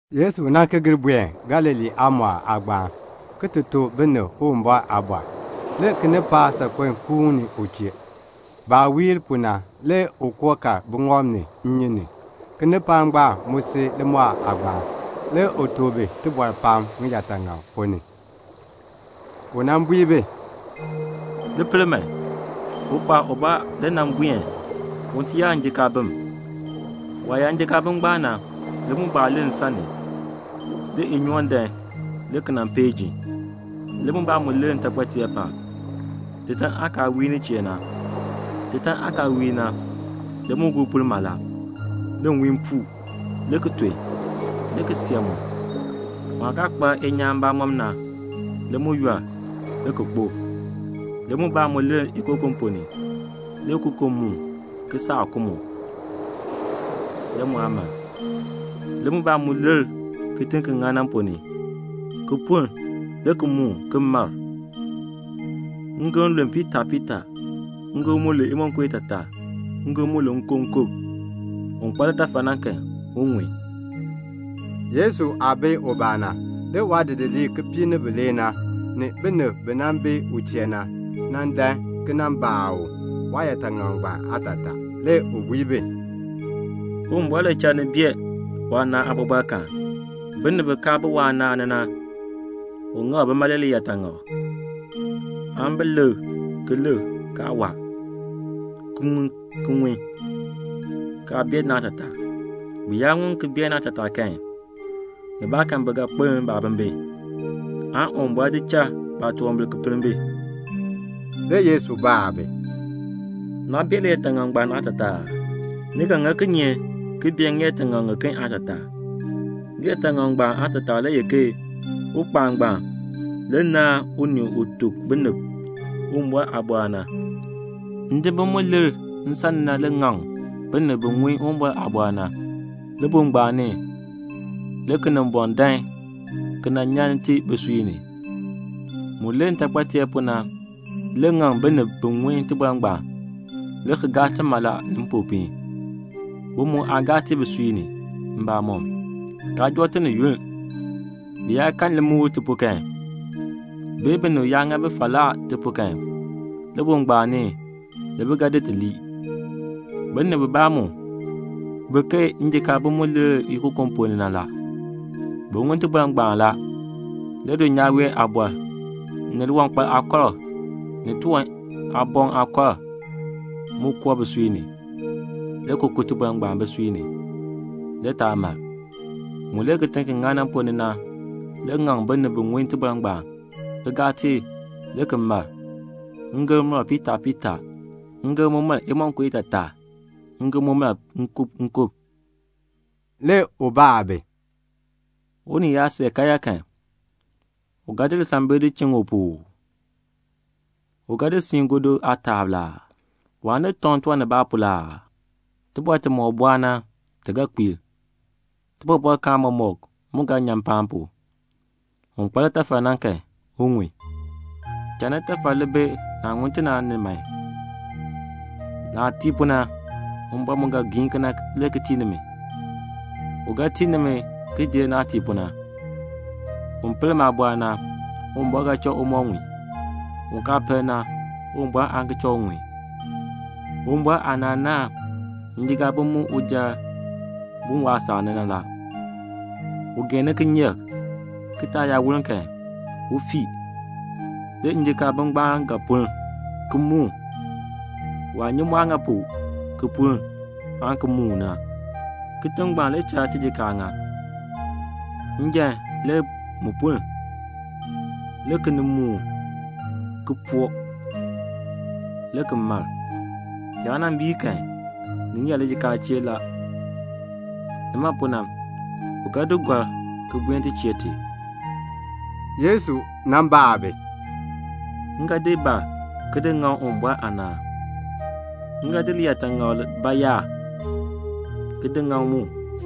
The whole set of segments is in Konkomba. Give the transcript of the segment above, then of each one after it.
Le Yesu ki gir buen Galilee aamɔɔl aagbaan, le ki tuk binib Uwumbɔr aaliin. Le kinipaak saakpeŋ ki kuuni u chee. Baah wiir pu na, le u koo kal buŋɔb ni, nnyun ni. Kinipaak ngbaan mu si limɔɔl aagbaan. Le u tuk bi tibɔr pam ŋiyaataŋak ponn ni. U bui bi, "Li pel man, ukpaal ubaa le nan buen un ti yaa njikaabim. Waah yaa njikaabim ngbaan na, le mubaa lir nsan ni. Le inyoon dan, le ki nan peei jin. Le mubaa mu lir ntaakpateer paab, titan aah kaa wiir nin chee na. Titan aah kaa wiir na, le mu guu puln mala. Le nwiin puu, le ki ton, le ki see mu. Mu aah kaa kpa inyaan mbamɔm na, le mu yɔl, le ki kpo. Le mubaa mu lir ikokon ponn ni. Le ikokon muun, le ki saa ku mu, le mu aa mar. Le mubaa mu lir kitiŋ ki ŋan na ponn ni, le ki puln, le ki muun, le ki mar. Ngem lu piitaa piitaa, ngem mu lu imonko itaataa, ngem mu lu nkub nkub. "Un kpa litafal na kan, un ŋun." Yesu aah bi ubaa na, le waadidiliib kipiik ni bilee, ni binib bi bi u chee na, nan dan ki nan baa u waayaataŋak ngbaan aatataa. Le u bui bi, "Uwumbɔr le cha ni bee waanaan aabɔbɔrkaan. Binib bi kaa bi waanaan ni na, u ŋak bima le ŋiyaataŋak, 'Aan bi lik ki lik, kaa waa, ki ŋun ki ŋun, kaa bee naatataa. Bi yaa ŋun ki bee naatataa kan, nibaakan bi ga kpeln baabimbin, aan Uwumbɔr di cha baatunwambir ki pinn bi."' Le Yesu baa bi, "Naa bee liyaataŋakl ngbaan aatataa aa? Ni ga ŋa kinye, ki bee ŋiyaataŋak ŋiken aatataa? Liyaataŋakl ngbaan aatataa le ye ke ukpaal ngbaan le ŋaŋ unii u tuk binib Uwumbɔr aaliin na. Ndibim mu lir nsan ni na le ŋaŋ binib bi ŋun Uwumbɔr aaliin na. Libuul ngbaan ni le Kinimbɔŋ dan ki nan nyan i bisui ni. Mu lir ntaakpateer pu na le ŋaŋ binib bi ŋun iliin ngbaan, le ki gaa i mala ni mpopiin. Bi mu aa gaa i bisui ni mbamɔm, kaa joo i ni yunn. Bi yaa kan limukl i pu kan, bee binib yaa ŋa bi falaa i pu kan, libuul ngbaan ni le bi ga di i lii. Binib bibaa mu bi ke njikaabim mu lir ikokon ponn ni na la. Bi ŋun iliin ngbaan la. Le dulnyaa wee aabɔr, ni liwankpal aakɔrk, ni tiwan aaboŋ aakɔrk mu koo bisui ni, le ki ku iliin ngbaan bisui ni, le yaa mar. Mu lir kitiŋ ki ŋan na ponn ni na le ŋaŋ binib bi ŋun iliin ngbaan, ki gaa i, le ki mar. Ngem mar piitaa piitaa, ngem mu mar imonko itaataa, ngem mu mar nkub nkub." Le u baa bi, "Unii yaa see karyaa kan, u ga di lisambil ki di chiŋ u pu uu? U ga di siin gɔdu aataab la aa? Waan di tɔŋ tiwan nibaa pu la aa? Tibɔr timɔk bɔɔ na, ti ga kpiir. Tibɔbɔrkaan mɔmɔk mu ga nyan mpaan pu. Un kpa litafal na kan, un ŋun. "Cha nitafal li bi naah ŋun ti na ni man. Naah tii pu na, Uwumbɔr mu ga giin kena le ki tii nimi. U ga tii nimi ki jer naah tii pu na. Un pel maaliin na, Uwumbɔr ga cha u moo ŋun. Un kaa pel na, Uwumbɔr aan ki cha u ŋun." "Uwumbɔr aanaan naahn njikaabim mu uja bun waasaak ni na la. U geeni kinyeek, kitaak yaa woln kan, u fii. Le njikaabim ngbaan ga puln, ki muun. Waa nyi mu aah ŋa pu ki puln, aan ki muuni na. Kitiŋ ngbaan le cha tijikaar ŋa. Njan le mu puln, le ki nin muun, le ki po, le ki mar. Ni yaa nan biir kan, ni ŋeer lijikaacheer la. Nima pu na, le u di gɔrk, ki buen ti chee ti." Le Yesu baa bi, "M ga di ba ki di ŋaŋ Uwumbɔr aanaan? M ga di liyaataŋakl bayaar ki di ŋaŋ mu?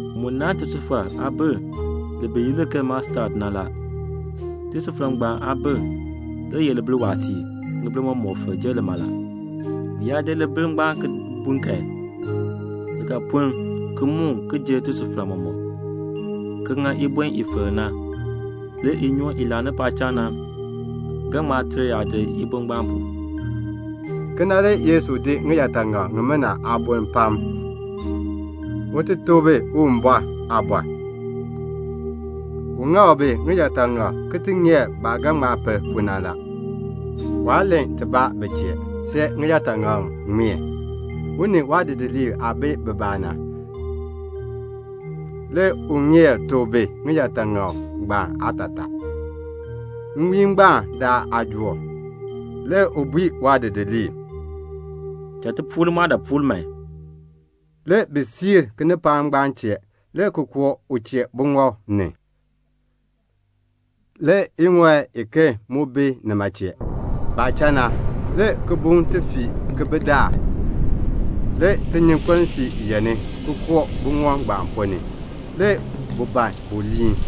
Mu naahn tisufar aabil li bi yi li ke mustad na. Tisufar ngbaan aabil le ye libil waatiir, ŋibil mɔmɔk filk jer lima la. Bi yaa di libil ngbaan ki bun kan, li ga puln ki muun ki jer tisufar mɔmɔk, ki ŋa ibon i filk na. Le inyoon i laani paacham na ga ŋma ter yaadir ibon ngbaan pu." Kena le Yesu di ŋiyaataŋak ŋimina aaboln pam, un ti tuk bi Uwumbɔr aaliin. U ŋak bi ŋiyaataŋak ki ti ŋeer baah ga ŋma pel pu na la. Waa len tibaa bi chee, see ŋiyaataŋak ŋmeen. U ni waadidiliib aah bi bibaa na, le u ŋeer tuk bi ŋiyaataŋak ngbaan aatataa. Nwiin ngbaan daln aajook, le u bui waadidiliib, "Cha ti puur limɔɔdaapuul man." Le bi siir kinipaak ngbaan chee, le ki koo u chee buŋɔb ni. Le iŋɔi iken mu bi nima chee. Baah cha na, le kibuŋ ti fii ki bi daar. Le tinyunkpeln fii yeŋni, ki koo buŋɔb ngbaan ponn ni, le bu ban bu gbii.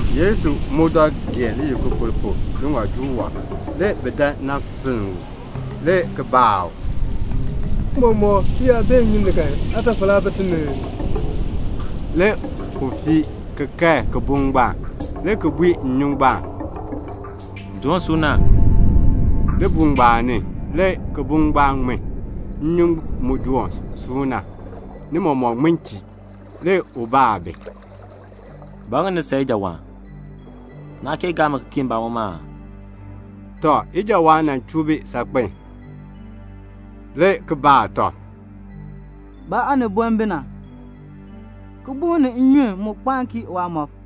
Yesu mu dɔ geen liyikukur pu, liŋɔjuul wɔb. Le bi dan nan finn u, le ki baa u, "Tiicha, ti yaa bee nnyun ni kan, aatafal aa bi ti ni ii?" Le u fii le ki kae kibuŋ ngbaan, le ki bui nnyun ngbaan, "Doon suuna." Libuul ngbaan ni, le kibuŋ ngbaan ŋmin, nnyun mu doon suuna, ni mɔmɔk ŋmin chii. Le u baa bi, "Ba ŋa ni san ijawaan? Naa kee gaa mi ki kii mbamɔm aa?" Le bi san ijawaan saakpen, le ki baa tɔb, "Ba aaniboln bi na? kibuŋ ni nnyun kii waamɔb."